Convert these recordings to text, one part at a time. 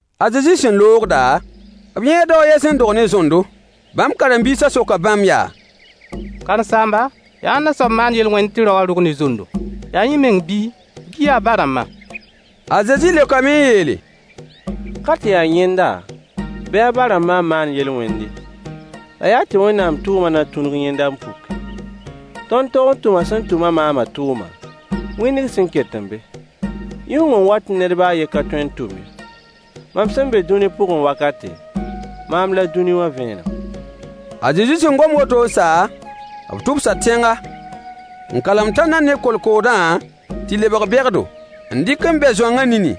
A Zezi sẽn loogda, b yãa dao a yen sẽn dog ne zondo. Bãmb karen-biisã soka bãmb yaa: Karen-saamba, yaa ãnna soab n maan yel-wẽnd tɩ rao wã rog ne zondo? Yaa yẽ meng bii, bɩ yaa a ba-rãmbã? A Zezi leokame n yeele: Ka tɩ yaa yẽnda bɩ a ba-rãmbã n maan yel-wẽnd ye, la yaa tɩ Wẽnnaam tʋʋmã na tũnug yẽnda n puki. Tõnd tog n tʋma sẽn tʋm-a maamã tʋʋma, wĩndg sẽn ket n be. Yʋng n wat tɩ ned baa a yen ka tõe n tʋm ye. Mam sẽn be dũni pʋgẽ wakate, maam la dũni wã vẽenem. A Zezi sẽn gom woto n sa, b tʋbsa tẽnga, n kalem tãndã ne kolkoodã tɩ lebg begdo, n dɩk n bɛ zoangã nini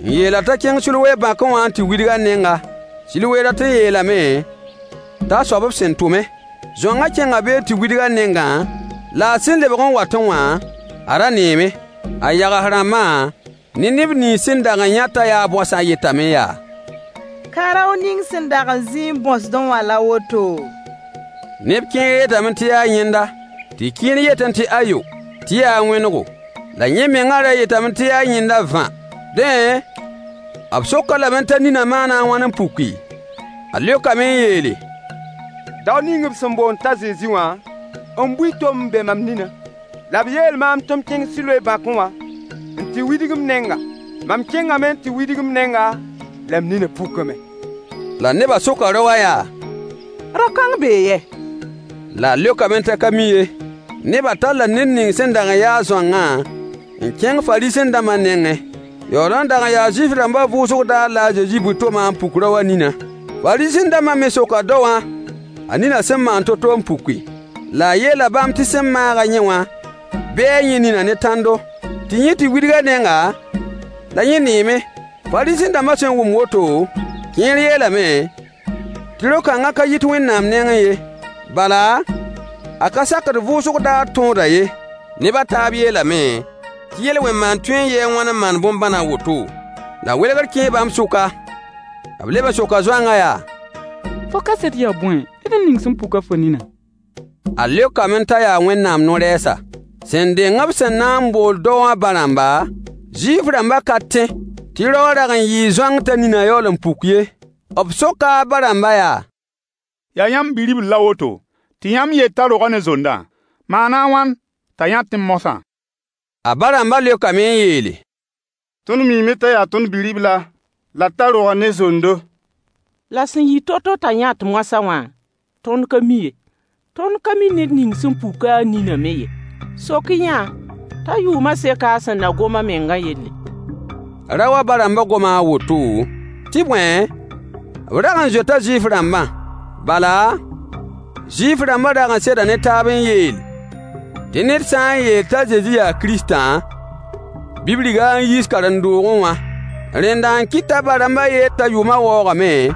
n yeel-a t'a kẽng Siloe bãkẽ wã n tɩ widg a nenga — Siloe dat n yeelame t'a soab b sẽn tʋme–. Zoangã kẽnga be n tɩ widg a nengã, la a sẽn lebg n watẽ wã, a ra neeme. A yags-rãmbã ne neb nins sẽn dag n yã t'a yaa bõasã yetame yaa: Ka rao ning sẽn dag n zĩ n bõosdẽ wã la woto? Neb kẽer yetame tɩ yaa yẽnda, tɩ kẽer yetẽ tɩ ayo, tɩ yaa a wẽnego. La yẽ mengã ra yetame tɩ yaa yẽnda vã. Dẽ, b sok-a lame t'a ninã maana a wãn n puki? A leokame n yeele: Dao ning b sẽn boond t'a Zezi wã n bui tom n bɛ mam ninã, la b yeel maam tɩ m kẽng Siloe bãkẽ wã n tɩ widg m nenga. Mam kẽngame n tɩ widg m nenga, la m ninã pukame. La nebã soka rao wã yaa: Rao-kãng bee yɛ? La a leokame t'a ka mi ye. Nebã talla ned ning sẽn dag n ya-a zoangã n kẽng Fariisẽ-dãmbã nengẽ. Yaool n dag n yaa Zuif-rãmbã vʋʋsg daar la a Zezi bui tomã n puk rao wã ninã. Fariisẽ-dãmbã me soka daowã a ninã sẽn maan to-to n puki. La a yeela bãmb tɩ sẽn maag-a yẽ wã bɛɛ yẽ ninã ne tãndo, tɩ yẽ tɩ widg a nenga, la yẽ neeme. Fariisẽ-dãmbã sẽn wʋm woto, kẽer yeelame tɩ rao-kãngã ka yit Wẽnnaam nengẽ ye. Bala, a ka sakd vʋʋsg daar tõodã ye. Neb a taab yeelame tɩ yel-wẽn maand tõe n yɩɩ a wãn n maan bõn-bãn a woto? La welgr kẽe bãmb sʋka. B leb n soka zoangã yaa: Fo kaset yaa bõe ne ned ning sẽn puk-a fo ninã? A leokame t'a yaa Wẽnnaam no-rɛɛsa. Sẽn deng b sẽn na n bool daowã ba-rãmba, Zuif-rãmbã ka tẽ tɩ rao wã dag n yɩɩ zoang t'a ninã yaool n puk ye. B soka a ba-rãmbã yaa: Yaa yãmb bi-ribl la woto, tɩ yãmb yet t'a roga ne zondã? Maana a wãn t'a yãtẽ moasã? A ba-rãmbã leokame n yeele: Tõnd miime t'a yaa tõnd bi-ribla, la t'a roga ne zondo. La sẽn yɩ to-to t'a yãt moasã wã, tõnd ka mi ye. Tõnd ka mi ned ning sẽn puk-a a ninã me ye. Sok-y-yã-a t'a yʋʋmã seka a sẽn na gom a mengã yelle. Rao wã ba-rãmbã goma a woto, tɩ bõe, b rag n zoeta Zuif-rãmbã. Bala, Zuif-rãmbã dag n seda ne taab n yeel tɩ ned sã n yeel t'a Zezi yaa Kiristã, bɩ b rig-a n yiis karen-doogẽ wã. Rẽnda n kɩt t'a ba-rãmbã yeel t'a yʋʋmã waoogame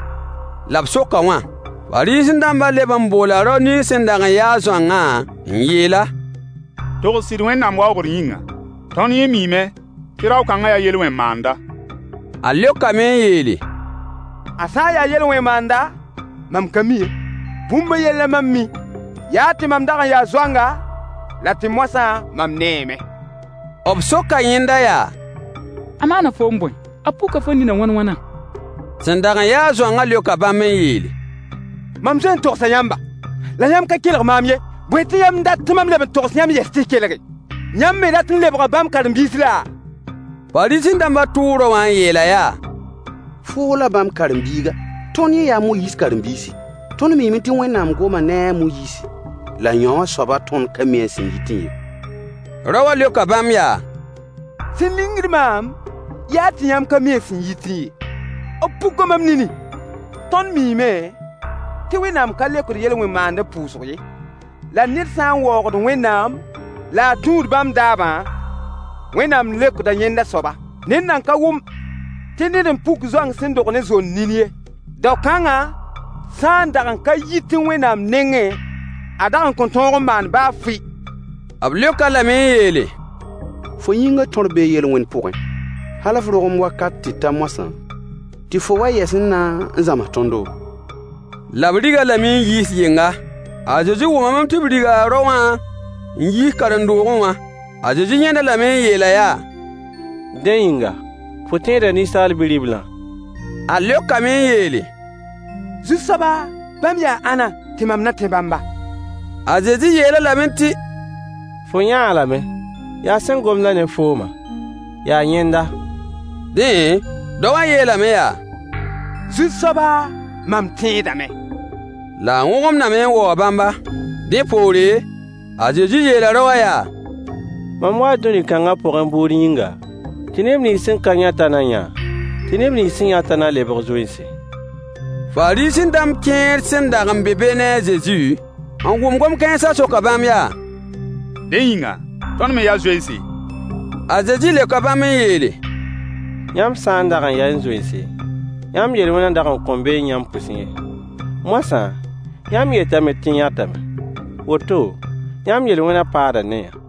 la b sok-a wã. Fariisẽ-dãmbã leb n boola rao ning sẽn dag n yaa-a zoangã n yeel-a: Togs sɩd Wẽnnaam waoogr yĩnga. Tõnd yẽ miime tɩ rao-kãngã yaa yel-wẽn maanda. A leokame n yeele: A sã n yaa yel-wẽn maanda, mam ka mi ye. Bũmb a yen la mam mi: yaa tɩ mam dag n yaa zoanga, la tɩ moasã mam neeme. B soka yẽnda yaa: A maana foom bõe? A puka fo ninã wãn-wãna? Sẽn dag n yaa-a zoangã leoka bãmb n yeele: Mam zoe n togsa yãmba, la yãmb ka kelg maam ye. Bõe tɩ yãmb dat tɩ mam leb n togs yãmb yɛs tɩ y kelge? Yãmb me dat n lebga bãmb karen-biis laa? Fariisẽ-dãmbã tʋʋ rao wã n yeel-a yaa: Foo la bãmb karen-biiga. Tõnd yẽ yaa a Moyiis karen-biisi. Tõnd miime tɩ Wẽnnaam goma ne a Moyiis, la yõwã soaba, tõnd ka mi a sẽn yitẽ ye. Rao wã leoka bãmb yaa: Sẽn lingd maam yaa tɩ yãmb ka mi a sẽn yitẽ ye. B puka mam nini. Tõnd miime tɩ Wẽnnaam ka leokd yel-wẽn maandb pʋʋsg ye. La ned sã n waoogd Wẽnnaam la a tũud bãmb daabã, Wẽnnaam leokda yẽnda soaba. Ned nan ka wʋm tɩ ned n puk zoang sẽn dog ne zond nin ye. Dao-kãngã sã n dag n ka yitẽ Wẽnnaam nengẽ, a dag n kõn tõog n maan baa fɩ. B leok-a lame n yeele: Fo yĩngã tõr bee yel-wẽn pʋgẽ, hal f rogem wakat tɩ ta moasã, tɩ fo wa yɛs n na n zãms tõndo? La b rig-a lame n yiis yɩnga. A Zezi wʋmame tɩ b riga rao wã n yiis karen-doogẽ wã. A Zezi yãnd-a lame n yeel-a yaa: Dẽ yĩnga, fo tẽeda Ninsaal Bi-riblã? A leokame n yeele: Zu-soaba, bãmb yaa ãnna, tɩ mam na tẽ bãmba? A Zezi yeel-a lame tɩ: Fo yãa-a lame, yaa sẽn gomd-a ne foomã, yaa yẽnda. Dẽ, dao wã yeelame yaa: Zu-soaba, mam tẽedame. La a wõgemdame n waoog bãmba. Dẽ poore, a Zezi yeela rao wã yaa: Mam waa dũni kãngã pʋgẽ bʋʋd yĩnga, tɩ neb nins sẽn ka yãtã na yã, tɩ neb nins sẽn yãtã na lebg zoense. Fariisẽ-dãmb kẽer sẽn dag n be be ne a Zezi, n wʋm gom-kãensã soka bãmb yaa: Dẽ yĩnga, tõnd me yaa zoense? A Zezi leoka bãmb n yeele: Yãmb sã n dag n yaẽ zoense, yãmb yel-wẽnã dag n kõn beẽ yãmb pʋsẽ ye. Moasã, yãmb yetame tɩ y yãtame. Woto, yãmb yel-wẽnã paada ne-yã.